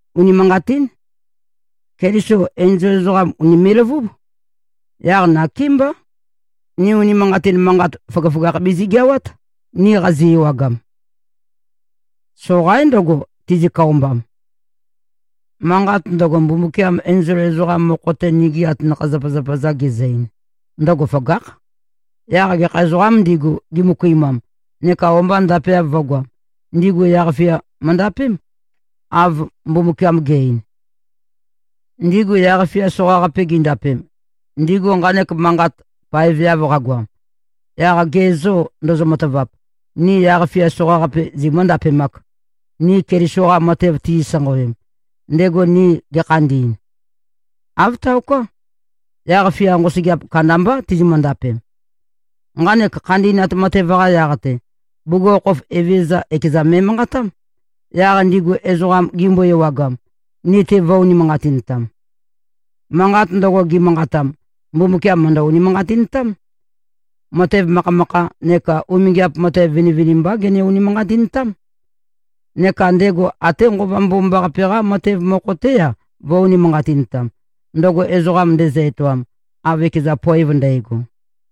Unimanqatín. Keliso enzol ezoqam ùnime꞉-løvúb. Yaq nakémbá, ni unimanqatin manqat, føgøføgakh bizigeawát, ni qazi-ewagam. Soqaín ndøgo, tizi-køombam. Manqat ndøgo, Mbumbukiam enzol ezoqam mokho-te, nigi atanakha-zapazapa-za gezø-ein, ndøgo føgákh. Yaq gekha ezoqām ndigu, gimøkuimam, neka o-mba ndapeav vø̄goam, ndigu yaq-fia møndapém, av Mbumbukiam ge꞉-ein. Ndigu yaq-fia soqaqape gindapem, ndigu nqanek manqat paeveav qagoam, yaq ge zô, ndozo-matavap, ni yaq-fia soqaqape zimǿ-ndapemāk, ni Keliso-qa matev tizi-sanqawem, ndego ni ge꞉khandi꞉n? Āv taoká. Yaq-fia nqosøgeap kandambá tizimø-ndapem. Nqanek khandi꞉nat matev-qa yaq-te, bugukhokhof Evezøza ekeza me꞉manqatám, yaq ndigu ezoqam, gimbo-ewagam, ni-te vø̄-unimanqatintam. Manqat ndøgo, gimanqatam, Mumbukiam mø̀ndø-unimanqatintám. Matev makhamakha neka umingiap matev vinivinimbá gene-unimanqatintám. Neka ndego até Nqova Mbomambaqape-qá matev mokho-té-a, vø̄-unimanqatintam, ndøgo ezoqa ndezø-etoam, av ekeza poev ndægo.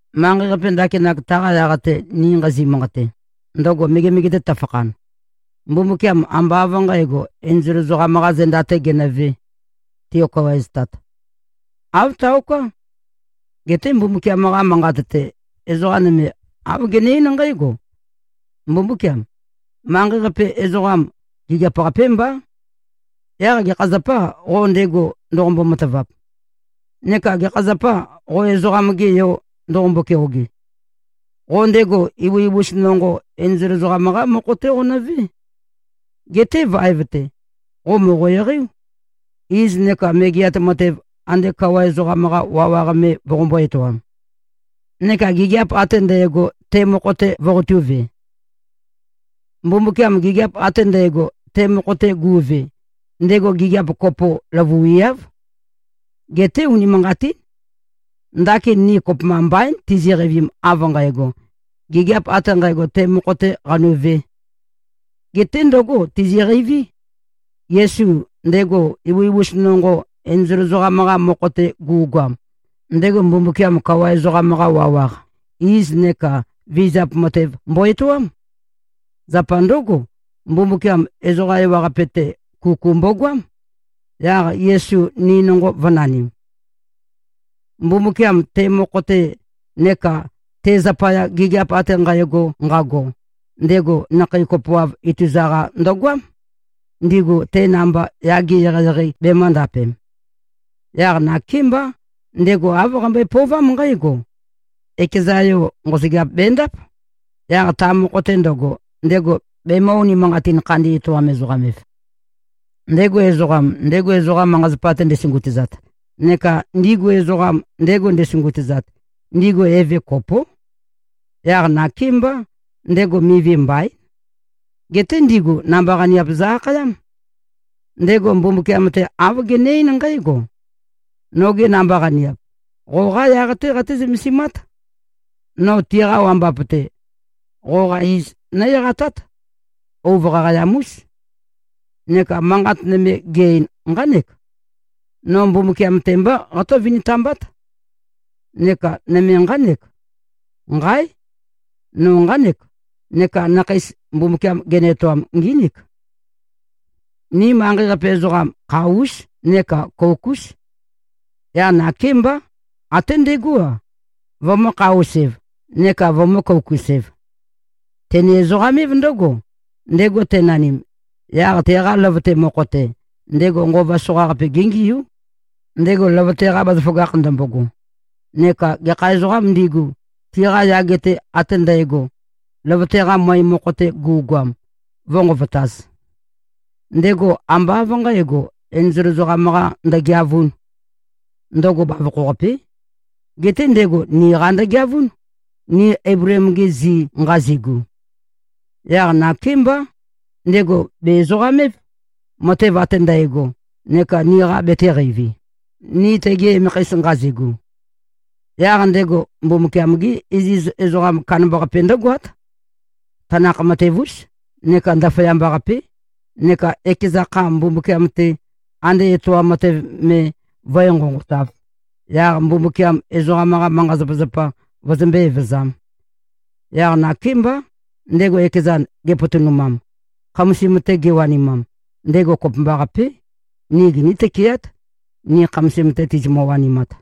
Manqei-qape ndakinak, taqa yaq-te ni nqazi꞉-manqate, ndøgo megemege-te to꞉fakhan, Mbumbukiam ambá av nqǣgo, enzol ezoqam-qā zenda-tē genøvē, tiokawaeztat. Āv taoká. Geté Mbumbukiam-qa Manqat-te, ezoqa nøme āv gene-eín nqǽgo, “Mbumbúkiam! Manqei-qape ezoqam, gigiap-qapé mbá. Yaq gekha zapâ, qo ndego ndoqombo-matavap? Neka gekha zapâ, qo ezoqam-ge yo ndoqombo-keoge? Qo ndego ibusa-ibusa nonqo, enzol ezoqam-qá mokho-té qonøvé. Geté vaev-te, qo mòqo-eqeiú, iz neka megeat matev ande kawa ezoqam-qa wawaq me voqombō-etoam. Neka gigiap ate ndægo, te mokho-te voqotūve.” Mbumbukiam gigiap ate ndægo, te mokho-te gu꞉ve, ndego gigiap kopo løvuiáv. Geté unimanqatín. Ndakin, ni kopømba mbaín, tiziqeivim av nqægo, gigiap ate nqægo, te mokho-tē qanuvē. Geté ndǿgo tiziqeiví. Yesu, ndego ibusa-ibusa nonqo, enzol ezoqam-qa mokho-te gu꞉goam, ndego Mbumbukiam kawa ezoqam-qa wawaq, iz neka vizap matev mbo-etoám. Zapa ndǿgo, Mbumbukiam ezoqa ewaqape-te, kuku mbogoám, yaq Yesu ni nonqo vø̄nanim. Mbumbukiam, te mokho-te neka te zapaya gigiap ate nqægo nqago, ndego nakhei kopoav ituza-qa ndøgoám, ndigu te namba yage eqeieqei bemø̄ndapem. Yaq nakémbá, ndego āv qambøe-pøovám nqǽgo: Ekeza Yo, nqosøgeap bendáp, yaq ta mokho-te ndøgo, ndego bemø̄-unimanqatin-khandi-etoam-ezoqam-ev. Ndego ezoqam, ndego ezoqa manqa-zapa-te ndesungutøzat, neka ndigu ezoqam, ndego ndesungutøzat, ndigu Eve kopó. Yaq nakémbá, ndego mivi mbaín. Geté ndigu namba-qaniap zø-akhayám. Ndego Mbumbukiam-te, āv gene-eín nqǽgo, “Nogi namba-qaniap, qoqá yaq-té qaté-zømesimát. No tiqa wambap-te, qoqa iz nó-eqatát. Ouv qaqayam-ús.” Neka manqat nøme ge-ein, nqánek, “No Mbumbukiam-te mbá qatǿ-vintambát.” Neka nøme nqánek, “Nqáe! No nqánek. Neka nakheis, Mbumbukiam genø-etoam ngínik.” Ni manqei-qape ezoqam, kha-ús neka kouk-ús. Yaq nakémbá, até ndegó-a, vømø̄-kha-us-ev neka vømø̄-kouk-us-ev. Tene-ezoqam-év ndǿgo, ndego tenanim, yaq teqa løvøte mokho-te, ndego nqova soqaqape géngiú, ndego løvøte-qa bazaføgakh ndømbogo, neka gekha ezoqām ndigu, tiqa yage-te ate ndægo, løvøte-qa møe mokho-te gu꞉goam, vǿnqovotāz. Ndego ambá av nqǣgo, enzol ezoqam-qa ndøgeavūn. Ndøgo bavokho-qapé. Geté ndego niqa ndøgeavún, ni Eibleem-gi zi nqazigu. Yaq nakémbá, ndego bè-ezoqam-év, matev ate ndægo, neka niqa betēqeivi, ni tegi emekheis nqazigu. Yaq ndego Mbumbukiam-gé iziz ezoqam kandambaqape ndǿgoát, tanakh-matev-ús neka ndaføyamba-qapé, neka ekeza kha Mbumbukiam-te, ande etoam matev me vǿe-nqonqotāv, yaq Mbumbukiam ezoqam-qa manqa-zapazapa vøzømbé-evøzām. Yaq nakémbá, ndego ekezan gepotonumam, khamasim-te gewanimam, ndego kopømbaqapé, ni giní-tøkeát, ni khamasim-te tizimø-wanimat.